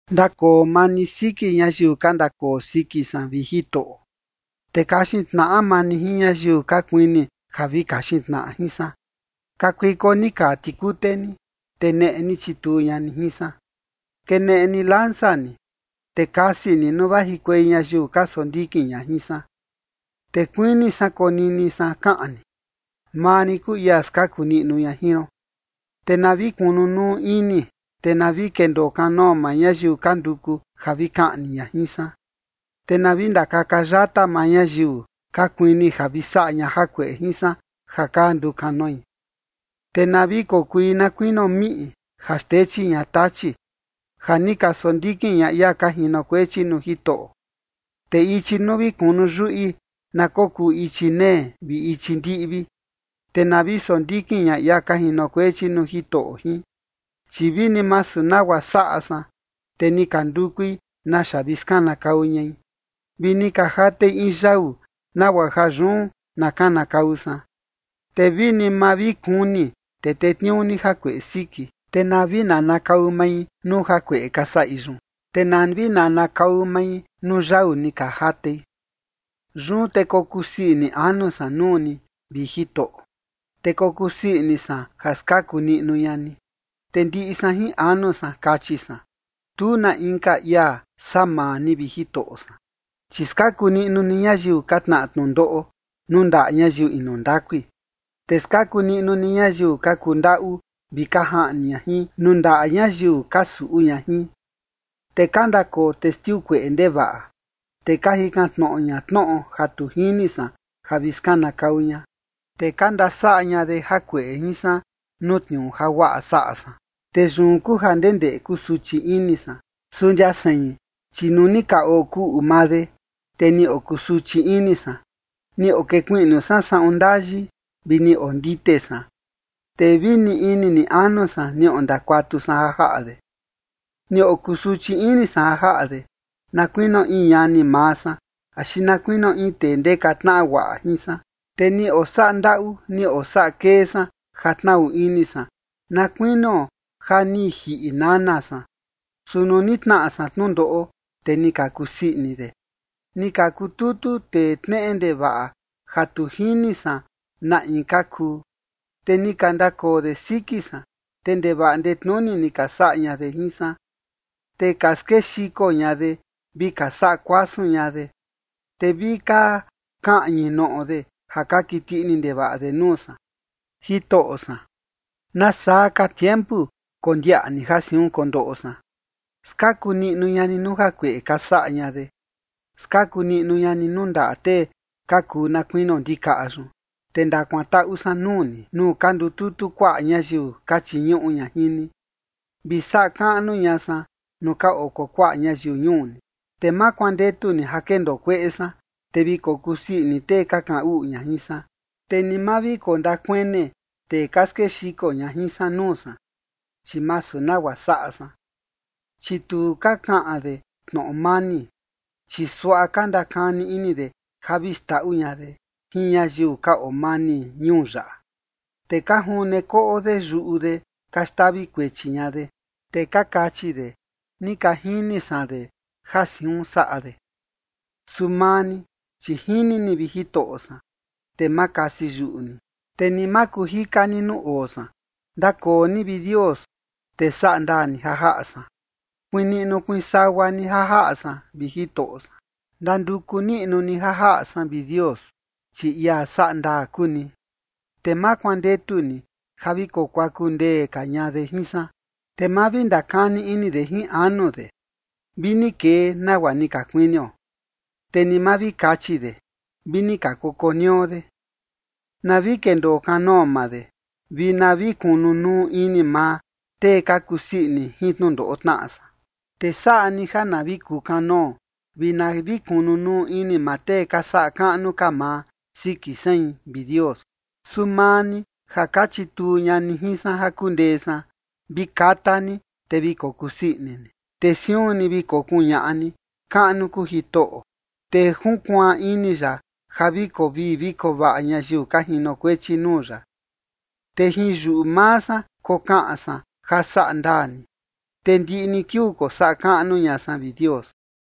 Ndakoo maa ni siki ñayiu ka ndakoo siki san, vi Jitoꞌo, te kaxin tnaꞌa maa ni jin ñayiu ka kuini ja vi kaxin tnaꞌa jin san. Kakuiko ni kaa tikute ni, te neꞌe ni, chituu ña ni jin san. Keneꞌe ni lanza ni, te kasi ni nuu vajikuei ñayiu ka sondikin ña jin san. Te kuini san konini san kaꞌan ni: “Maa rin kuu ia skaku niꞌnu ña jin ron”. Te na vi kunu nuu ini, vi na vi kendoo kanoo maa ñayiu ka nduku ja vi kaꞌni ña jin san. Te na vi ndakaka yata maa ñayiu ka kuini ja vi saꞌa ña jakueꞌe jin san ja ka ndukanoi. Te na vi kokui na kuinio miꞌi ja xtechi ña tachi, ja ni ka sondikin ña ia ka jinokuechi nuu Jitoꞌo. Te ichi nuu vi kunu yuꞌi na kokuu ichi nee vi ichi ndiꞌvi, te na vi sondikin ña ia ka jinokuechi nuu Jitoꞌo jin. Chi vini masu nagua saꞌa san, te ni ka ndukui naxa vi skanakau ñai, vi ni ka jatei in yau nagua ja yun na kanakau san. Te vini ma vi kuni, te tetniuu ni jakueꞌe siki, te na vi nanakau mai nuu jakueꞌe ka saꞌi yun, te na vi nanakau mai nuu yau ni ka jatei. Yun te kokusii ini anu san nuu ni, vi Jitoꞌo, te kokusii ini san ja skaku niꞌnu ña ni. Te ndiꞌi san jin anu san kachi san: “Tu na inka ia saa maa ni, vi Jitoꞌo san, chi skaku niꞌnu ni ñayiu ka tnaꞌa tnundoꞌo nuu ndaꞌa ñayiu inu ndakui, te skaku niꞌnu ni ñayiu ka kundaꞌu vi ka jaꞌni ña jin, nuu ndaꞌa ñayiu ka suꞌu ña jin”. Te ka ndakoo testiu kueꞌe ndevaꞌa, te ka jikan tnoꞌo ña tnoꞌo ja tu jini san ja vi skanakau ña. Te ka ndasaꞌa ña de jakueꞌe jin san nuu tniuu ja guaꞌa saꞌa san, te yun kuu ja ndendeꞌe kusuchi ini san. Su ndia sein, chi nuu ni ka okuꞌu maa de, te ni okusuchi ini san, ni okekuiꞌnu san saꞌun ndayi, vi ni ondite san, te vi ni ini ni anu san ni ondakuatu san ja jaꞌa de. Ni okusuchi ini san ja jaꞌa de, na kuinio in ñani maa san axi na kuinio in tee ndeka tnaꞌa guaꞌa jin san, te ni osaꞌa ndaꞌu ni osaꞌa kee san ja tnaꞌu ini san, na kuinio ja ni jiꞌi nana san. Su nuu ni tnaꞌa san tnundoꞌo, te ni ka kusii ini de, ni ka kututu tee tneꞌe ndevaꞌa ja tu jini san na in ka kuu, te ni ka ndakoo de siki san, te ndevaꞌa ndetnuni ni ka saꞌa ña de jin san. Te ka skexiko ña de vi ka saꞌa kuasun ña de, te vi ka kaꞌñi noꞌo de ja ka kiti ini ndevaꞌa de nuu san. Jitoꞌo san, ¿nasaa ka tiempu kondiaꞌa ni ja siun kondoꞌo san? Skaku niꞌnu ña ni nuu jakueꞌe ka saꞌa ña de. Skaku niꞌnu ña ni nuu ndaꞌa tee ka kuu na kuinio ndikaꞌa yun. Te ndakuantaꞌu san nuu ni, nuu ka ndututu kuaꞌa ñayiu ka chiñuꞌu ña jin ni, vi saꞌa kaꞌnu ña san nuu ka oo kuakuaꞌa ñayiu ñuu ni. Te ma kuandetu ni ja kendoo kueꞌe san, te vi kokusii ini tee ka kaꞌan uꞌu ña jin san. Te ni ma vi kondakuene tee ka skexiko ña jin san nuu san, chi masu nagua saꞌa san. Chi tu ka kaꞌan de tnoꞌo mani, chi suaꞌa ka ndakani ini de ja vi xndaꞌu ña de jin ñayiu ka oo mani ñuu yaꞌa. Te ka june koꞌo de yuꞌu de ka xtavi kuechi ña de, te ka kachi de: “Ni ka jini san de ja siun saꞌa de”. Su maa ni, chi jini ni, vi Jitoꞌo san, te ma kasi yuꞌu ni, te ni ma kuu jika ni nuu oo san. Ndakoo ni, vi Dios, te saꞌa ndaa ni ja jaꞌa san, kuiin niꞌnu kuiin sagua ni ja jaꞌa san, vi Jitoꞌo san. Ndanduku niꞌnu ni ja jaꞌa san, vi Dios, chi ia saꞌa ndaa kuu ni, te ma kuandetu ni ja vi kokuaku ndee ka ña de jin san. Te ma vi ndakani ini de jin anu de: “Vi ni kee nagua ni ka kuinio”. Te ni ma vi kachi de: “Vi ni ka koko nio de”. Na vi kendoo kanoo maa de, vi na vi kunu nuu ini maa tee ka kusii ini jin tnundoꞌo tnaꞌa san, te saꞌa ni ja na vi kuu kanoo vi na vi kunu nuu ini maa tee ka saꞌa kaꞌnu ka maa siki sein, vi Dios. Su maa ni ja ka chituu ña ni jin san ja kundee san, vi kata ni, te vi kokusii ini ni. Te siun ni vi kokuñaꞌa ni: “Kaꞌnu kuu Jitoꞌo, te junkuaan ini ya ja vi koo vii vi koo vaꞌa ñayiu ka jinokuechi nuu ya”. Te jin yuꞌu maa san kokaꞌan san ja saꞌa ndaa ni, te ndiꞌi ni kiuu kosaꞌa kaꞌnu ña san, vi Dios.